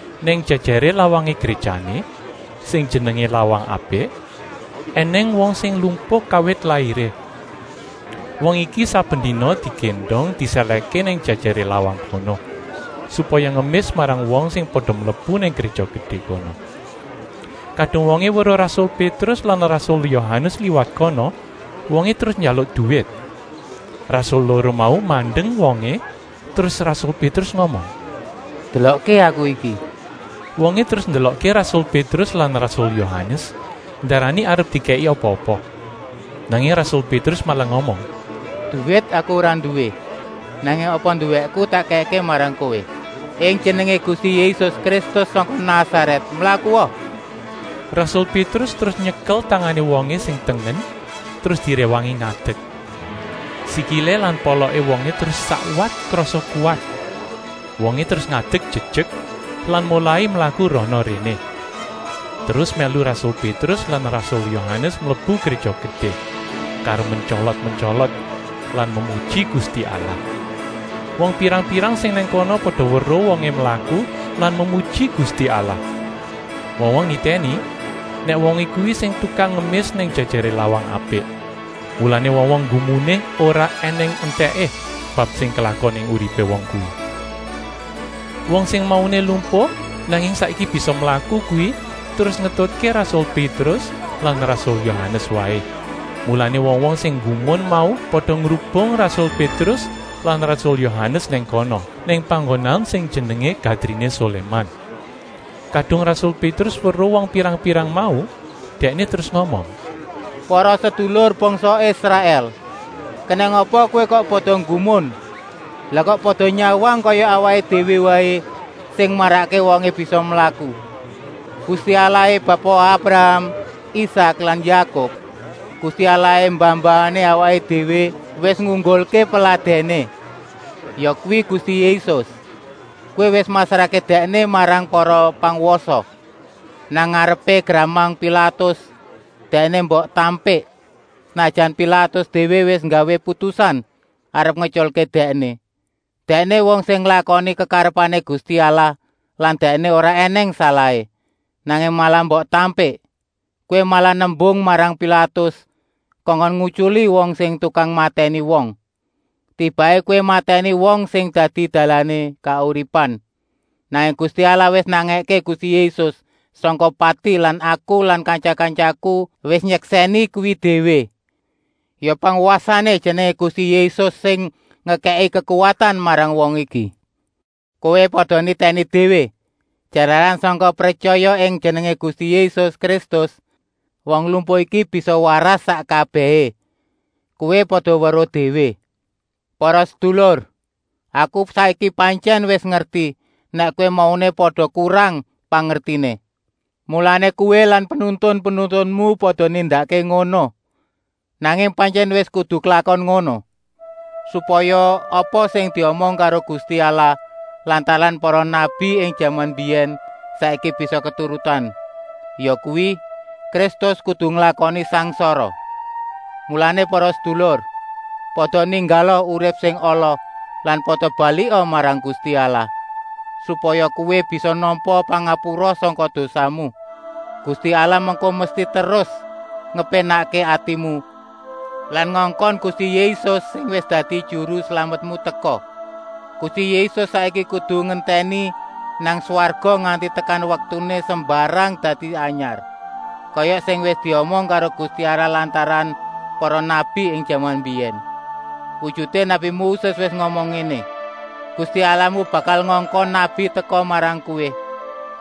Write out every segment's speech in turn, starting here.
Nang jèjèré lawangé gréjané, sing jenengé Lawang Apik, ènèng wong sing lumpuh kawit lairé. Wong iki saben dina digéndong disèlèhké nang jèjèré lawang kono, supaya ngemis marang wong sing pada mlebu nang Gréja Gedé kono. Kadung wongé weruh rasul Pétrus lan rasul Yohanes liwat kono, wongé terus njaluk duwit. Rasul loro mau mandeng wongé terus rasul Pétrus ngomong: “Delokké aku iki!” Wongé terus ndelokké rasul Pétrus lan rasul Yohanes, ndarani arep dikèki apa-apa. Nanging rasul Pétrus malah ngomong: “Duwit aku ora nduwé, nanging apa nduwéku tak kèkké marang kowé: ing Jenengé Gusti Yésus Kristus sangka Nasarèt, mlakua!” Rasul Pétrus terus nyekel tangané wongé sing tengen terus diréwangi ngadek. Sikilé lan poloké wongé terus sakwat krasa kuwat. Wongé terus ngadek jejek lan molai mlaku rana-réné, terus mèlu rasul Pétrus lan rasul Yohanes mlebu Gréja Gedé karo mentyolot-mentyolot lan memuji Gusti Allah. Wong pirang-pirang sing nang kono pada weruh wongé mlaku lan memuji Gusti Allah. Wong-wong nitèni nèk wongé kuwi sing tukang ngemis nang jèjèré Lawang Apik. Mulané wong-wong nggumuné ora ènèng entèké bab sing klakon ing uripé wong kuwi. Wong sing mauné lumpuh nanging saiki bisa mlaku kuwi terus ngetutké rasul Pétrus lan rasul Yohanes waé, mulané wong-wong sing nggumun mau pada ngrubung rasul Pétrus lan rasul Yohanes nang kono, nang panggonan sing jenengé Gadriné Soléman. Kadung rasul Pétrus weruh wong pirang-pirang mau, dèkné terus ngomong: “Para sedulur bangsa Israèl, kenèng apa kowé kok pada nggumun. Lah kok pada nyawang kaya awaké déwé waé sing marakké wongé bisa mlaku. Gusti Allahé Bapa Abraham, Isak lan Yakub, Gusti Allahé mbah-mbahané awaké déwé, wis ngunggulké peladèné, yakuwi Gusti Yésus. Kowé wis masrahké Dèkné marang para pangwasa, nang ngarepé gramang Pilatus. Dèkné mbok tampik, senajan Pilatus déwé wis nggawé putusan arep ngetyulké Dèkné. Dèkné wong sing nglakoni kekarepané Gusti Allah lan Dèkné ora ènèng salahé, nanging malah mbok tampik. Kowé malah nembung marang Pilatus kongkon ngutyuli wong sing tukang matèni wong. Tibaké kowé matèni wong sing dadi dalané kauripan. Nanging Gusti Allah wis nangèké Gusti Yésus sangka pati lan aku lan kantya-kantyaku wis nyeksèni kuwi déwé. Ya pangwasané Jenengé Gusti Yésus sing ngekèki kekuwatan marang wong iki. Kowé pada nitèni déwé, jalaran sangka pretyaya ing jenengé Gusti Yésus Kristus wong lumpuh iki bisa waras sak kabèhé. Kowé pada weruh déwé. “Para sedulur, aku saiki pantyèn wis ngerti nèk kowé mauné pada kurang pangertiné. Mulané kowé lan penuntun-penuntunmu pada nindakké ngono. Nanging pantyèn wis kudu klakon ngono, supaya apa sing diomong karo Gusti Allah lantaran para nabi ing jaman mbiyèn saiki bisa keturutan, yakuwi: Kristus kudu nglakoni sangsara. Mulané para sedulur, pada ninggala urip sing ala lan pada balika marang Gusti Allah, supaya kowé bisa nampa pangapura sangka dosamu. Gusti Allah mengko mesti terus ngepénakké atimu lan ngongkon Gusti Yésus, sing wis dadi Juru Slametmu, teka. Gusti Yésus saiki kudu ngentèni nang swarga nganti tekan waktuné sembarang dadi anyar, kaya sing wis diomong karo Gusti Allah lantaran para nabi ing jaman mbiyèn. Wujuté nabi Moses wis ngomong ngéné: ‘Gusti Allahmu bakal ngongkon nabi teka marang kowé,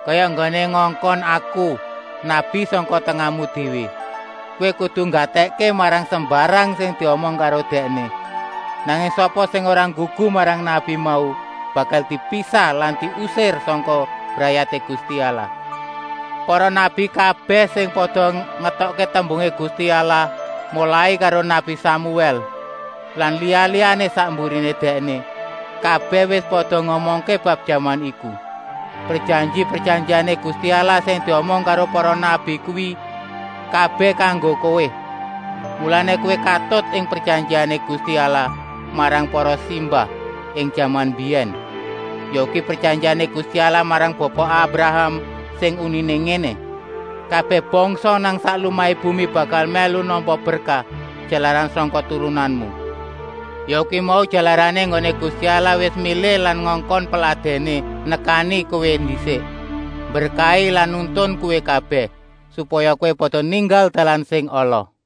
kaya enggoné ngongkon aku, nabi sangka tengahmu déwé. Kowé kudu nggatèkké marang sembarang sing diomong karo dèkné. Nanging sapa sing ora nggugu marang nabi mau, bakal dipisah lan diusir sangka brayaté Gusti Allah.’ Para nabi kabèh sing pada ngetokké tembungé Gusti Allah, molai karo nabi Samuèl lan liya-liyané sak mburiné dèkné, kabèh wis pada ngomongké bab jaman iku. Prejanji-prejanjiané Gusti Allah sing diomong karo para nabi kuwi kabèh kanggo kowé. Mulané kowé katut ing prejanjiané Gusti Allah marang para simbah ing jaman mbiyèn, yakuwi prejanjiané Gusti Allah marang Bapa Abraham sing uniné ngéné: ‘Kabèh bangsa nang sak lumahé bumi bakal mèlu nampa berkah, jalaran sangka turunanmu.’ Yakuwi mau jalarané enggoné Gusti Allah wis milih lan ngongkon Peladèné nekani kowé ndisik, mberkahi lan nuntun kowé kabèh, supaya kowé pada ninggal dalan sing ala.”